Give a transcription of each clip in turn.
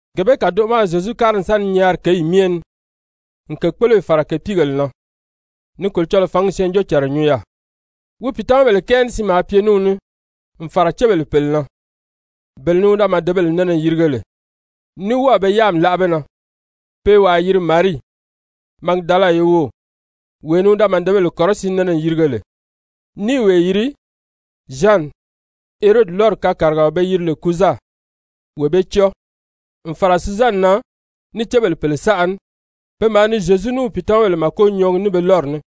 Gee bee kàdoʔo ma a Zyezu kári n sa ni nyaari kěyi myɛ ni, n kèkpoloyi fàra kèpiigèle na, ni Kolocɔlɔɔ fǎngi syɛɛnjóocànra nyuu yaà. Wi pìitamabèle kɛɛ ní siin maa pye ní wi ní n fàra cébèle pèle na, bele ni wi da màdebēle nɛnɛ n yirige lè ní wɔ́ɔ̀ be yáami láʔa be na. Pe i wàa yiri Marii, Magidala ye wów, wee ni wi da màdebèle kɔrɔsiin nɛnɛ n yirige lè, ní i wee yiri Zyani, Herodi lɔ́ri kàrigafɔlɔ pe yiri lè Kuza, wee bee cɔ́ɔ, n fàra Suzani na ní cébèle pèle saʔa ní, pe maa ni Zyezu ní wi pìitamabèle màko nyɔɔgi ní be lɔ́ri ní.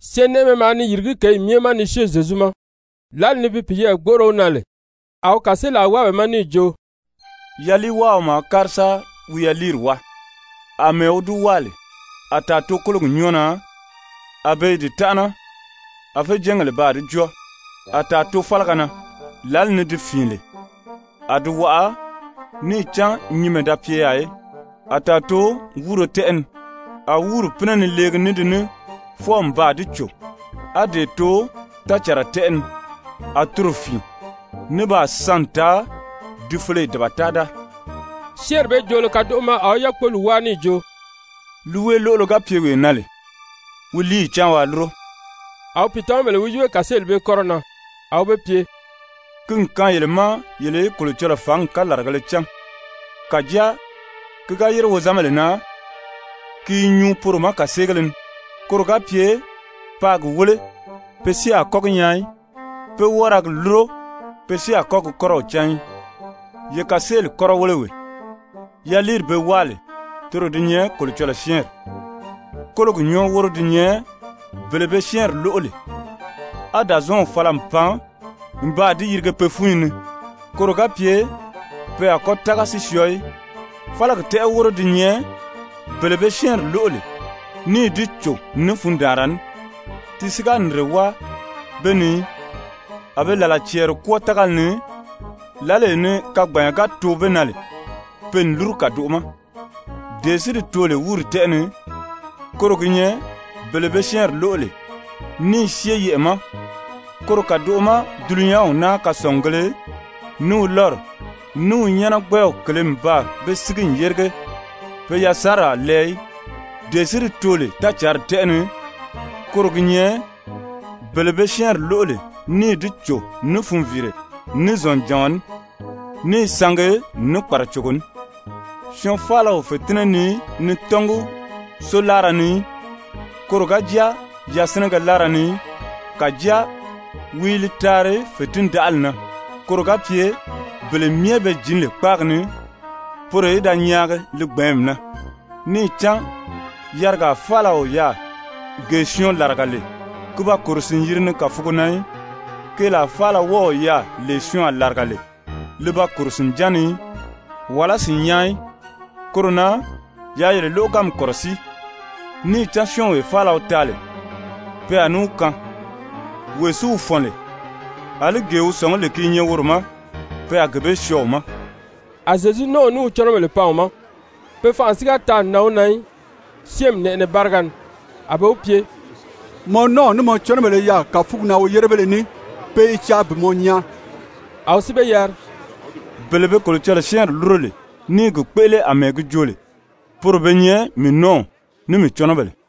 Syɛɛnnɛʔɛmɛ maa ni yìrigí kěyi myɛ ma ni syée Zyezu ma. Lǎli ni bi piyɛɛ gbóʔoro wi na lè, a wi kàseelaa wáa be ma níì jo: «Yaliiwáaɔ maa kári sa wi yaliiri wáa. Amɛɛ wi di wáa lè, a tàa too kólogi nyɔ́ɔ na, a be i di tánʔana, a féjɛɛngèle baa di jɔ́ɔ. A tàa too fálaga na. Lǎli ni di fìin lè, a di waʔa, níì cán nyinmɛ da pye yaà í. A tàa too wúuro tɛ́ʔɛ ni. A wúuri pínɛ ni leegi ní di ní fwɔɔ n baa di cò. A dee too tácànra tɛ́ʔɛ ni. A toro fìin, ní baa san n taa di feleye dabata-da.» Syɛ́ɛnri bee joolo kadoʔo ma a wi yákpoli wáa níì jo: «Líiweeloʔolo ga pye wee na lè, wi líiyi cáan waa lúro.» A wi pìitamabèle wi yíbe kàseeli bee kɔ́rɔ na. A wi be pye: «Ki n kaan yele ma yele í Kolocɔlɔɔ fǎngi kalaragēle cán. Kàjáa ki ga yére wozanbèle na, ki i nyuu poro ma kàseegéle ni. ‹Koro ga pye paa gi wéle, pe si a kɔ́ gi nyaa í. Pe wɔ́ɔ ra gi lúro, pe si a kɔ́ gi kɔ́rɔw cán í.› «Ye kàseeli kɔ́rɔ wéle wee: Yaliiri be wáa lè, toro di nyɛ Kolocɔlɔɔ syɛ́ɛnri. Kólogi nyɔ́ɔ wóro di nyɛ bele be syɛ́ɛnri lóʔo lè, á Dàzɔɔnw fala n pan n baa di yirige pe fúnyi ni koro ga pye pe a kɔ́ tága si syɔɔ í. Fálagi tɛ́ʔɛ wóro di nyɛ bele be syɛ́ɛnri lóʔo lè níì di cò ní fundaanra ní, ti si ga nìnre wáa be ni í, a be làlaa cɛɛri kwɔ́ɔ tágali ni. Lǎlee ni kagbanya ga too be na lè, pe n lúru kàdoʔo ma. Dee si di too lè wúuri tɛ́ʔɛ ni, koro gi nyɛ bele be syɛ́ɛnri lóʔo lè, ní i syée yɛʔɛ̀ ma. Koro kàdoʔo ma dulunyanw naa kasɔngugēle, ní wi lɔ́ri, ní wi nyáanagbɛw kèlē n baa be sígi n yérige, pe yasanri a lɛɛ í. Dee si di too lè tácǎnri tɛ́ʔɛ ni, koro gi nyɛ bele be syɛ́ɛnri lóʔo lè níì di cò ní funviire, ní zɔ̀njàɔn ní, ní i sangi ní kpàracogo ní. «Syɔɔn faala o fètinnɛ nii ni tɔ́ngi sóo láara ni í, koro ga jáa yasinɛgɛ láara ni í. Kàjáa wi i li taari fètindaʔali na koro ga pye bele be jǐn lè kpáagi ni, poro í da nyaagi li gbɛ̀ɛ́nmi na. Níì cán yarigaa faala o yaà gee syɔɔn làriga lè ki ba kòro sìn-yiri ni kàfugo na í, keelaa faala wɔ́ɔ o yaà lee syɔɔn a làriga lè, li ba kòro sìnján ni í, wàlá sìnnyaa í. Koro na yaa yele lóʔoganmi kɔ̀rɔsíi. Níì cán syɔ́ɔnwee faala wi taa lè, pe a ní wi kaan. Wee si wi fɔ̀n lè, àlí gee wi sɔ̀ngí lè ki i nyɛ woro ma, pe a gee bee syɔɔ wi ma.» A Zyezu nɔ́ɔw ní wi cɔnɔbèle pan wi ma, pe fanʔa si ga taa n nan wi na í syɛ́ɛnmi nɛʔɛnɛ báriga ni. A be wi pye: «Mɔ nɔ́ɔw ní mɔ cɔnɔbèle i yaà kàfugi na woyérebéle ní, pe i caa bi mɔ nyaa.» A wi si be yari: «Bele be Kolocɔlɔɔ syɛ́ɛnri lúro lè ní i gi kpéʔele àmɛɛ gi joo lè, poro be nyɛ mii nɔ́ɔw ní mii cɔnɔbèle.»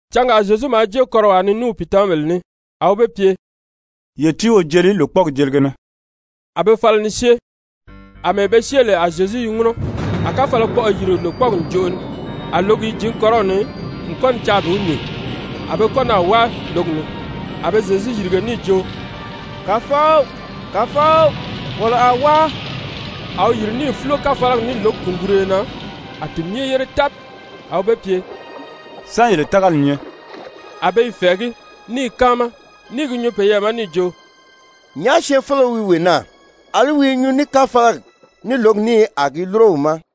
Cangaa Zyezu maa jée kɔ́rɔwaa ni ní wi pìitamabèle ní. A wi be pye: «Ye tíi wo jeli lòkpɔɔgi jelige na.» A be fala ni syée. Amɛɛ be syée lè a Zyezu i ŋúnɔ. A káfalakpɔʔɔ yìri lòkpɔɔgi ǹjoʔo ni, a lǒgi i jǐn kɔ́rɔw ni n kɔ́ ni caa bi wi nyìn, a be kɔ́ naà wáa lǒgi ni. A be Zyezu yìrige níì jo: «Kàfɔw, Kàfɔw, wolo a wáa!» A wi yìri níì fúlo káfalagi ní lǒgi kùnguruyo na, a di yére tábi. A wi be pye: «Sán yele tágali nyɛ?» A be i fɛ̀ɛgí, ní i káama, ní i gi nyuu peyɛɛ ma níì jo: «Nyàʔá syɛɛnfeleo wi wee naa? Alí wi i nyuu ní káfalagi, ní lǒgi ní, a di i lúro wi ma.»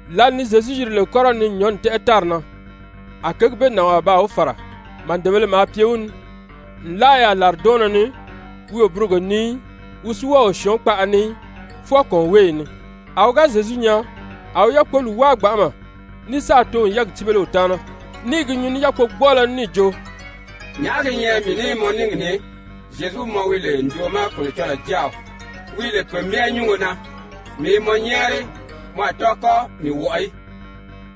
Lǎli ni Zyezu yiri lè kɔ́rɔw ni n nyɔ̌nni tɛ́ʔɛ tári na, a kěgi bee nànwaa baa wi fàra, màdebēle maa pye wi ni. Nlaa yaà làridɔɔnnɔ ni wi o burogo nii í, wi si wɔ́ɔ o syɔ̀ɔ́n kpaʔa ni í, fwɔɔ kɔ̀ɔnweeyi ni. A wi ga Zyezu nyaa, a wi yákpoli wáa gbanʔama, ní sáà too n yɛ́ɛgi cíbele wi taana, ní i gi nyuu ní yákpogbɔɔlɔ ní níì jo: «Nyàʔá gi nyɛ mii ní mɔ níngi ni, Zyezu mɔ wi lè ǹjoʔo ma Kolocɔlɔɔ Jáaw, wi lè Pe Myɛ Nyúngo na? Mii i mɔ nyɛ́ɛri, mɔ a tɔ́ɔ kɔ́ mii wɔʔɔ í.»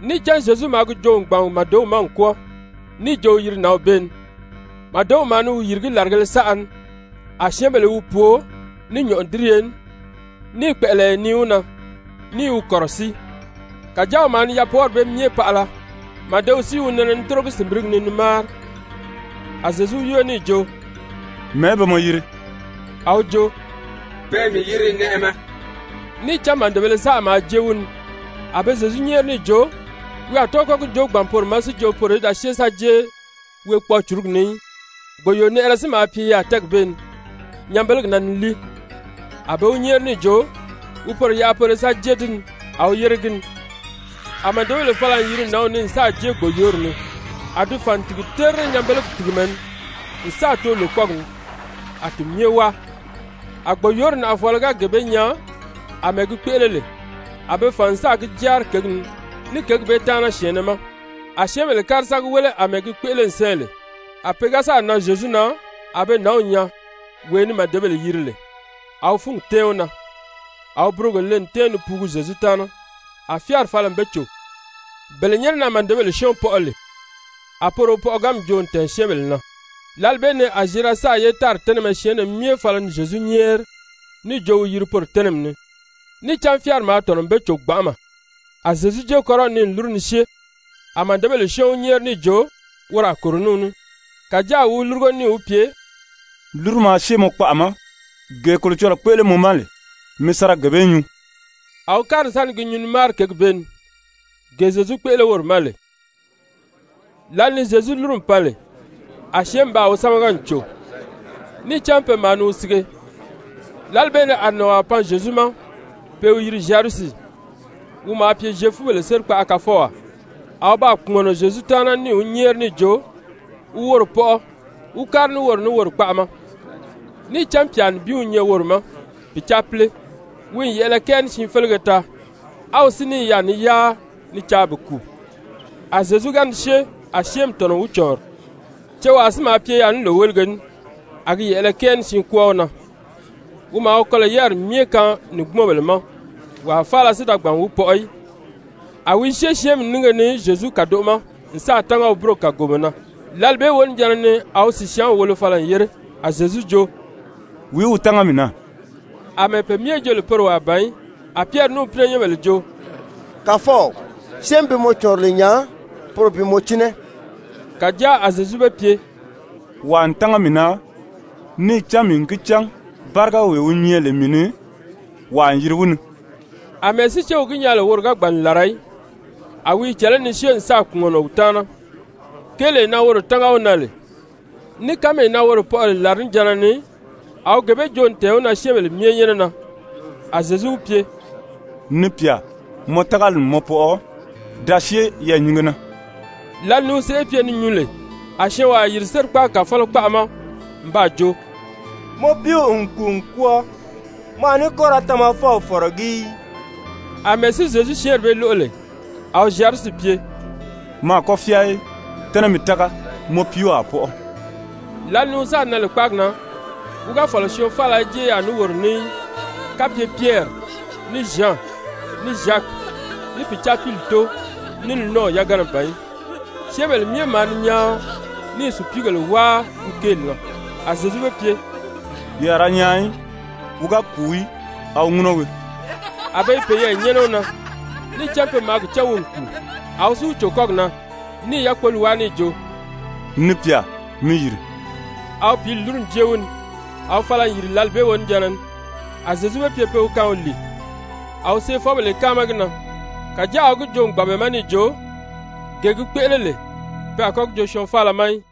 Níì cán Zyezu maa gi joo n gbàn màdew ma n kwɔ́ɔ níì jo wi yiri nǎnw bee ni, màdew maa ni wi yìrigí làrigēle saʔa ni. A syɛ́ɛnbèle i wi pwoo ní nyɔ̀ʔɔdiriye ní, ní i kpɛ̀ʔɛlɛyɛ nii wi na, ní i wi kɔ̀rɔsíi. Kàjáa wi maa ni yapwɔɔri bee myɛ paʔala, màdew si i wi nɛnɛ ni tórogi sìnbirigi ni ni máari. A Zyezu wi yíbe níì jo: «Mɛ̀ɛ́ be mɔ yiri?» A wi jo: «Pe i mii yiri Nɛʔɛmɛ.» Níì cán màdebēle saʔa maa jée wi ni. A be Zyezu nyɛ́ɛri níì jo wi a tɔ́ɔ kɔ́ gi joo bi gbàn poro ma si jo poro í da syée sa jée weekpɔɔ-cùrugi ni í. Gbòyoonɛʔɛrɛ si maa pye yaà tɛ́ɛgi bee ni nyanbelegi na ni líi, a be wi nyɛ́ɛri níì jo wi poro yaʔa poro í sa jée di ni. A wi yére gi ni. A màdebèle fala n yiri nǎnw ni n sáà jée gbòyoori ni, a di fàn n tìgi terire nyanbelegi tìgimɛ ni n sáà too lòkpɔɔgi ni, a ti myɛ wáa. A gbòyoori nàʔafɔɔlɔ ga gee bee nyaa àmɛɛ gi kpéʔele lè, a be fàn n sáà gi jáari kěgi ni ní kěgi bee taana syɛ̀ɛnnɛ ma. A syɛ́ɛnbèle kári sa gi wéle àmɛɛ gi kpéʔele n sɛ́ɛ lè. A pe ga sáà nan Zyezu na, a be nǎnw nyaa, wee ni màdebèle yiri lè, a wi fúngi tɛ́ɛn wi na, a wi burogo le n tɛ́ɛn ni puugu Zyezu taana, a fyáari fala n be cò. Bele nyɛ́nɛ na màdebèle syɔ́ɔn pɔʔɔ lè, a poro wi pɔʔɔganmi joo n tɛ̀ɛn syɛ́ɛnbèle na. Lǎli bee ni a Zyerasa ye tári tɛ́nɛmɛ syɛɛnnɛ myɛ fala ni Zyezu nyɛ́ɛri níì jo wi yiri poro tɛ́nɛmi ni, níì cán fyáari maa tɔ̀nɔ n be cò gbanʔama. A Zyezu jée kɔ́rɔw ni n lúru ni syée. A màdebèle syɔ́ɔn wi nyɛ́ɛri níì jo woro a kòro ní wi ní. Kàjáa a wi wi lúrugo níì wi pye: «Lúru maa syée mɔ kpaʔa ma, gee Kolocɔlɔɔ kpéʔele mɔ ma lè, mi sa ra gee bee nyuu.» A wi kári n sa ni gi nyuu ni máari kěgi bee ni, gee Zyezu kpéʔele woro ma lè. Lǎli ni Zyezu lúru n pan lè, a syɛ́ɛnmi baa wi sámaga n cò, níì cán pe myɛ maa ni wi sige. Lǎli bee ni a nànwaa pan Zyezu ma pe i wi yiri Zyayirusi, wi maa pye Zyefubèle sérikpaʔa kafɔwaa. A wi baa kpùmɔnɔ Zyezu taana níì wi nyɛ́ɛri níì jo wi woro pɔʔɔ wí kári ní woro ní woro kpaʔa ma. Níì cán pyà nibin wi nyɛ woro ma, pìcaapile, wi n yɛ̀ʔɛlɛ kɛɛ ní siin félege taa, a wi si ní i yaà ni yáa ni caa bi kùu. A Zyezu ga ni syée, a syɛ́ɛnmi tɔ̀nɔ n wi cɔ̀ɔnri. Cewaa si maa pye yaà ní lòwelige ní, a gi yɛ̀ʔɛlɛ kɛɛ ní siin kwɔ́ɔ wi na, [wi maa wi kɔlɔ̀ yáriri myɛ kaan nìngbumɔnbèle ma,] wàa faala si da gbàn n wi pɔʔɔ í. A wi i syée syɛ́ɛnmi nínge ni Zyezu kàdoʔo ma n sáà tánga wi búrogi kàgomɔ na. Lǎli bee wonijanna ni a wi sìsyaanw wolo fala n yére. A Zyezu jo: «Wìí wi tánga mii na?» Amɛɛ pe myɛ jo lè poro wàa ban í, a Pyɛri [ní wi pínɛnyɛnbèle] jo: «Kàfɔw, syɛ́ɛnmi bi mɔ cɔ̀ɔnri lè nya, poro bi mɔ cínɛ.» Kàjáa a Zyezu be pye: «Wàa n tánga mii na, níì cán mii n gi cán bárigawee wi nyɛ lè mii ni, wàa n yiri wi ni.» Amɛɛ si céw gi nyaa lè woro ga gbàn n làra í, a wi i cɛ̀lɛ́ ni syée n sáà kpùmɔnɔ wi taana, kéelee na woro tánga wi na lè, ní kánmee na woro pɔʔɔ lè làrinijanna ni, a wi gee bee joo n tɛ̀ɛn wi na syɛ́ɛnbèle myɛ nyɛ́nɛ na. A Zyezu wi pye: «Ni pyà, mɔ tágali n mɔ pɔʔɔ. Da syée yɛɛ̀nyinge na.» Lǎli ni wi sèʔê pye ni nyuu lè, a syɔɔnwaa yìri sérikpaagi kàfɔlɔ kpaʔa ma n baa jo: «Mɔ piiw n kùu n kwɔ́ɔ. Mɔ a ní kɔ́ ra Tamafɔw fɔ̀rɔgí í.» Amɛɛ si Zyezu syɛ́ɛnri bee lóʔo lè, a wi Zyayirusi pye: «Mɔ a kɔ́ fyáa í, tɛ́nɛ mi tága. Mɔ piiw a pɔʔɔ.» Lǎli ni wi sáà nan lè kpáagi na, wi ga fɔ̀lɔ syɔɔn faala í jée yaà ní woro ní í, kapye Pyɛri, ní Zyan, ní Zyaki, ní pìcaapili tóo, ní li nɔ́ɔw yagana ban í. Syɛ́ɛnbèle myɛ maa ni nyaan ní i sùpiigèle wáa wi kéeli na. A Zyezu be pye: «Ye a ra nyaan í. Wi ga kùu í, a wi ŋúnɔ wii.» A be i peyɛɛ nyɛ́nɛ wi na, níì cán pe maa gi cán wi n kùu. A wi si wi cò kɔ́gi na níì yákpoli wáa níì jo: «Ni pyà, mi yìri.» A wi pǐli lúru n jée wi ni, a wi fala n yìri lǎli bee wonijanna ni. A Zyezu be pye pe wi kaan wi lìi. A wi seefɔbèle i káama gi na, kàjáa a wi gi joo n gbàn be ma níì jo, gee gi kpéʔele lè pe a kɔ́ gi joo syɔɔn faala ma í.